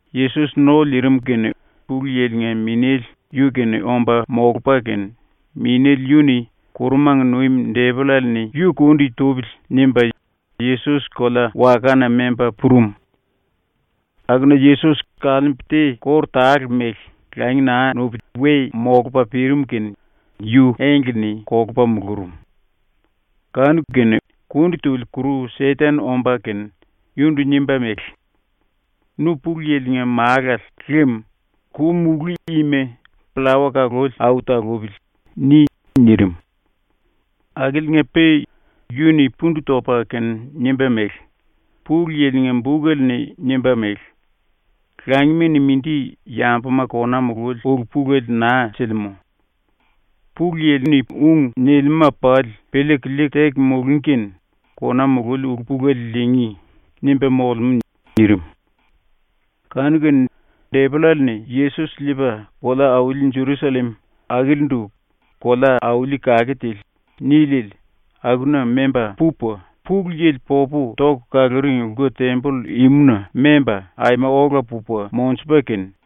Yesos ⸤no liirim kene Pulu Yili-nga Minéle yu-kene omba molupa kene,⸥ Minéle yu-ni ‘⸤Kurumanga nuim⸥ depollale-ni yu kundi tupili.’ nimba Yesos kolea-wakana memba purum. Akuna Yesos kaliimbu te kóru tale mele langi naa nuli we molupa pirim kene yu engle-ni kolupa mulurum. Kanu-kene kundi tuli ⸤kuru Seten⸥ omba kene yundu nimba mele: “Nu Pulu Yili-nga Málale lem ku-mulú ima ‘Pllawa kaluli au talupili.’ ni.” nirim. Akiliinga-pe yu-ni pundu topa kene nimba mele: “Pulu Yili-nga bukele-ni nimba mele: ‘Langima-ni mindi yambuma kona mululi ulu-pulele naa silimú. Pulu Yili-ni ung nilimúma pali piliiku liiku teku mulungí kene kona mululi ulu-pulele liingí.’ nimba molemú.” nirim. Kanu-kene depollale-ni Yesos liipa kolea-auli Jerusallem, akilindu ‘kolea-auli kake tili’ niliele, akuna memba pupa, Pulu Yili popu toku kaluring lku-temboll imuna memba, aima ola pupa monjupa kene,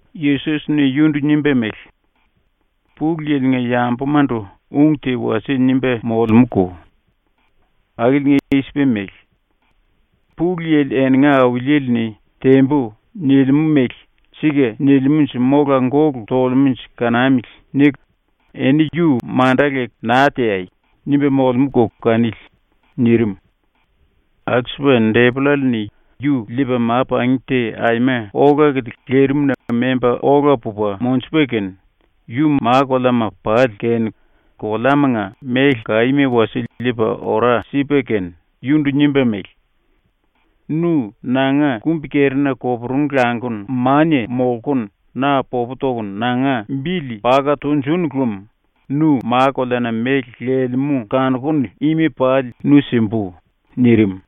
Yesos-ni yundu nimba mele: “Pulu Yili-nga yambumandu ung te wasie nimba molemúko. Akili i-sipa mele: ‘Pulu Yili eninga Auliele-ni “Tembu.” nilimú mele ‘Sika nilimúnje mola gólu tolemúnje kanamili.’ niku eni yu manda leku naa teai.’ nimba molemúko kanili.” nirim. Alsupa depollale-ni yu liipa ma-pangí te aima ola-kilia lirimna memba ola pupa monjupa kene, yu ma-koleama pali kene koleamanga méle kaíma wasie liipa ora sipa kene yundu nimba mele: “Nu nanga kumbi-kerina koporungu languku mania molkunu na popu tokunu nanga bili paka tunjúnu lem nu ma-koleana méle lelemú kanokunu ima pali nu simbu.” nirim.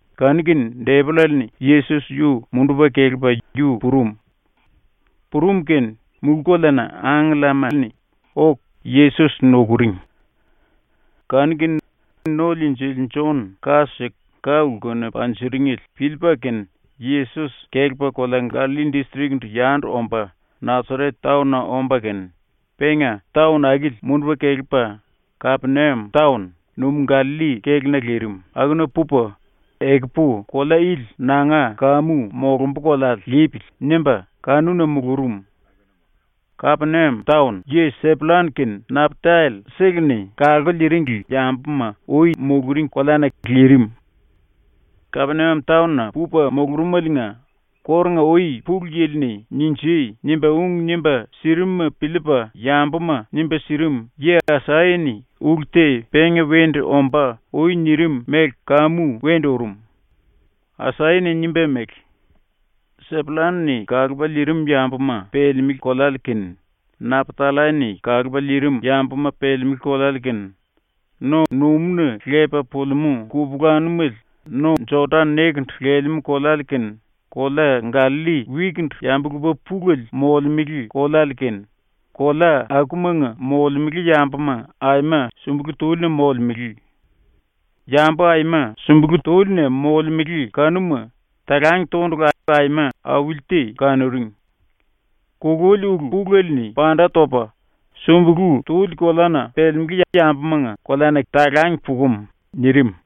Kanu-kene depollale-ni Yesos yu mundupa kelepa yu purum. Purum kene ⸤mulú-koleana⸥ angkellama-ni oku Yesos nukuring. Kanu-kene ⸤No-Liinjili⸥ Jon ka siku ka-lkuna panjiringele piliipa kene Yesos kelepa kolea Gallalli distrik-ndu yandu omba Nasaret taon-na omba kene, penga taon akili mundupa kelepa Kapeniam taon, numú-Gallalli kéluna lirim, akuna pupa ‘Ekupu kolea ili nanga kamu molumbu koleale lipili.’ nimba akuna mulurum. Kapeniam yi Sepullan kene Naptallai-seleni kalku liiringli yambuma ui muluring koleana lirim. ⸤Kapeniam taon-na pupa mulurumeliinga⸥ kórunga-ui Pulu Yili-ni “Ninjui!” nimba ung nimba sirimuma piliipa yambuma nimba sirim yi Asaya-ni ulu te penga wendu ombá ui nirim mele kamu wendu urum. Asaya-ni nimba mele: “Sepullan-ni kalupa liirim yambuma pelemelé koleale kene, Naptallai-ni kalupa liirim yambuma pelemelé koleale kene, no-numúna lepa pulimú kupulanumele no-Jodan nekendu lelemú koleale kene, kolea Gallalli wikindu yambu-lupa pulele molemele koleale kene, kolea akumanga molemele yambuma ⸤aima sumbulú túlina molemele⸥. Yambu aima sumbulú túlina molemele kanuma talang tondulu aima auli te kanuring. Kululi ulu-pulele-ni panda topa sumbulú tuli koleana pelemelé yambumanga koleana talang pukum.” nirim.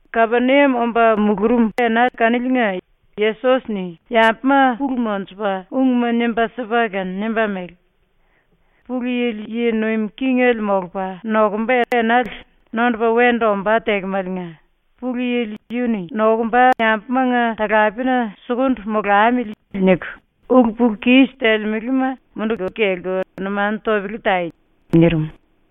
⸤Kapeniam omba mulurum⸥ ena kaniliinga Yesos-ni yambuma pulu monjupa ungma nimba sipa kene nimba mele: “Pulu Yili yi nuim kingele molupa nokumba enale nondupa wendu ombá tekemaliinga ⸤‘Pulu Yili yu-ni nokumba yambumanga talapena sukundu molamili.’ niku⸥ ulu-pulu-kis telemelema munduku kelku numanu topele tai.” nirim.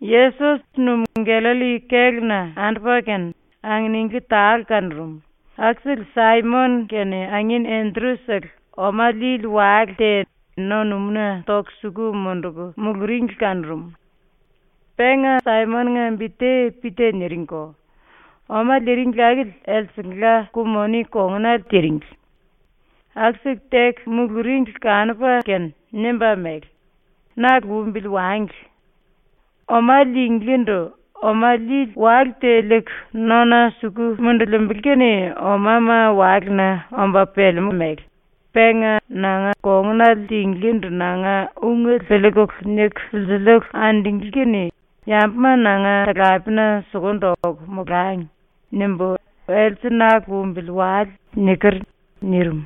Yesos Numú-Gallalli kéluna andupa kene anginingli tale kanurum, akusele Saimon kene angin Endru-sele oma liili wale te no-numúna toku suku munduku muluringli kanurum. Penga Saimon-nga bi te Pita niringko. Oma liiringli akili elsengla ku-moni kongunale tiringli. ⸤Aku-siku teku muluringli kanupa kene⸥ nimba mele: “Na lumbili wangli. Oma liinglíndu oma liili wale te liiku nona suku mundulimbili kene omama walena omba pelemú mele, penga ‘nanga kongunale tinglíndu nanga ungele piliikulu niku silsiliiku andunglí kene yambuma nanga talapena sukundu oku molangi.’ nimbu ‘Else na lumbili wale.’ niker.” nirim.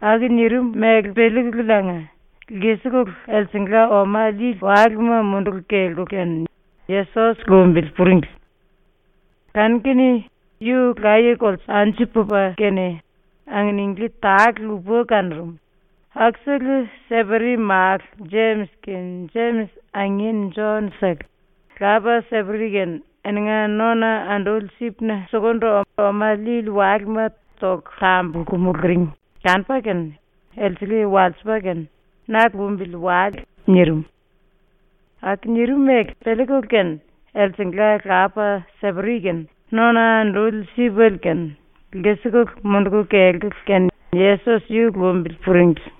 ⸤Aku nirim mele piliikululiinga⸥ lkisikulu elsengla oma liili walema munduku kelkulu kene Yesos lumbili puringli. Kanu-kene yu laye-kolte anju pupa kene anginingli tale lupa kanurum, akusele Seperi málu Jemis kene Jemis angin Jon-sele, lapa Seperi kene eninga nona anduli sipna sukundu oma liili walema toku tambulku muluring kanupa kene elsele walsipa kene “Na lumbili wale.” nirim. Aku nirim mele piliikulu kene elsengla lapa Seperi kene nona anduli sipele kene lkisikulu munduku kelkulu kene Yesos yu lumbili puringli.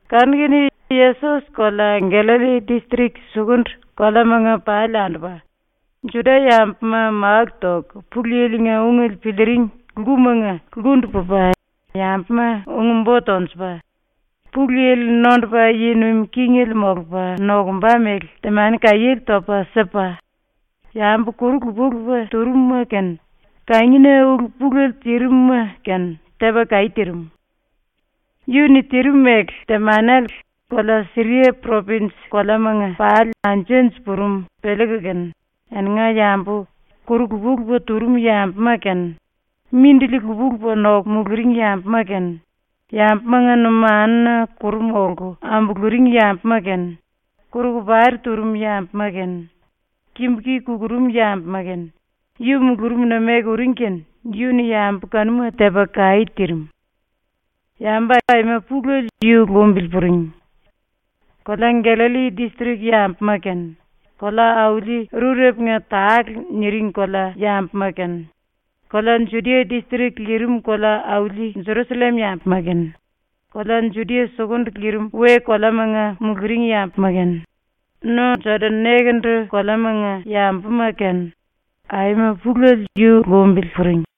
Kanu-kene Yesos kolea Gallalli distrik sukundu koleamanga pali andupa, Juda-yambuma máku toku Pulu Yili-nga ungele piliiring lkumanga lkundu pupa yambuma ung-bo tonjupa, Pulu Yili nondupa yi nuim kingele molupa nokumba mele temani kaiéle topa sipa, yambu kuru lupa-lupa turum-ma kene kangina ulu pulele tirim-ma kene tepa kaí tirim. Yu-ni tirim mele temanele kolea Siria propinj koleamanga pali anju-anju purum piliiku kene eninga yambu kuru lupa-lupa turum yambuma kene, mindili lupa-lupa noku muluring yambuma kene, yambumanga numanuna kuru molku ambuluring yambuma kene, kuru-kopari turum yambuma kene, kimbu-ki kukurum yambuma kene, yu mulurumna meku uring kene yu-ni yambu kanuma tepa kaí tirim. Yambu aima pulele yu lumbili puring. Kolea Gallalli distrik yambuma kene, ‘Kolea-Auli Rurepunga Tale’ niring kolea yambuma kene, kolea Judia distrik lirim kolea-auli Jerusallem yambuma kene, kolea Judia sukundu lirim we-koleamanga muluring yambuma kene, no Jodan nekendu koleamanga yambuma kene, aima pulele yu lumbili puring.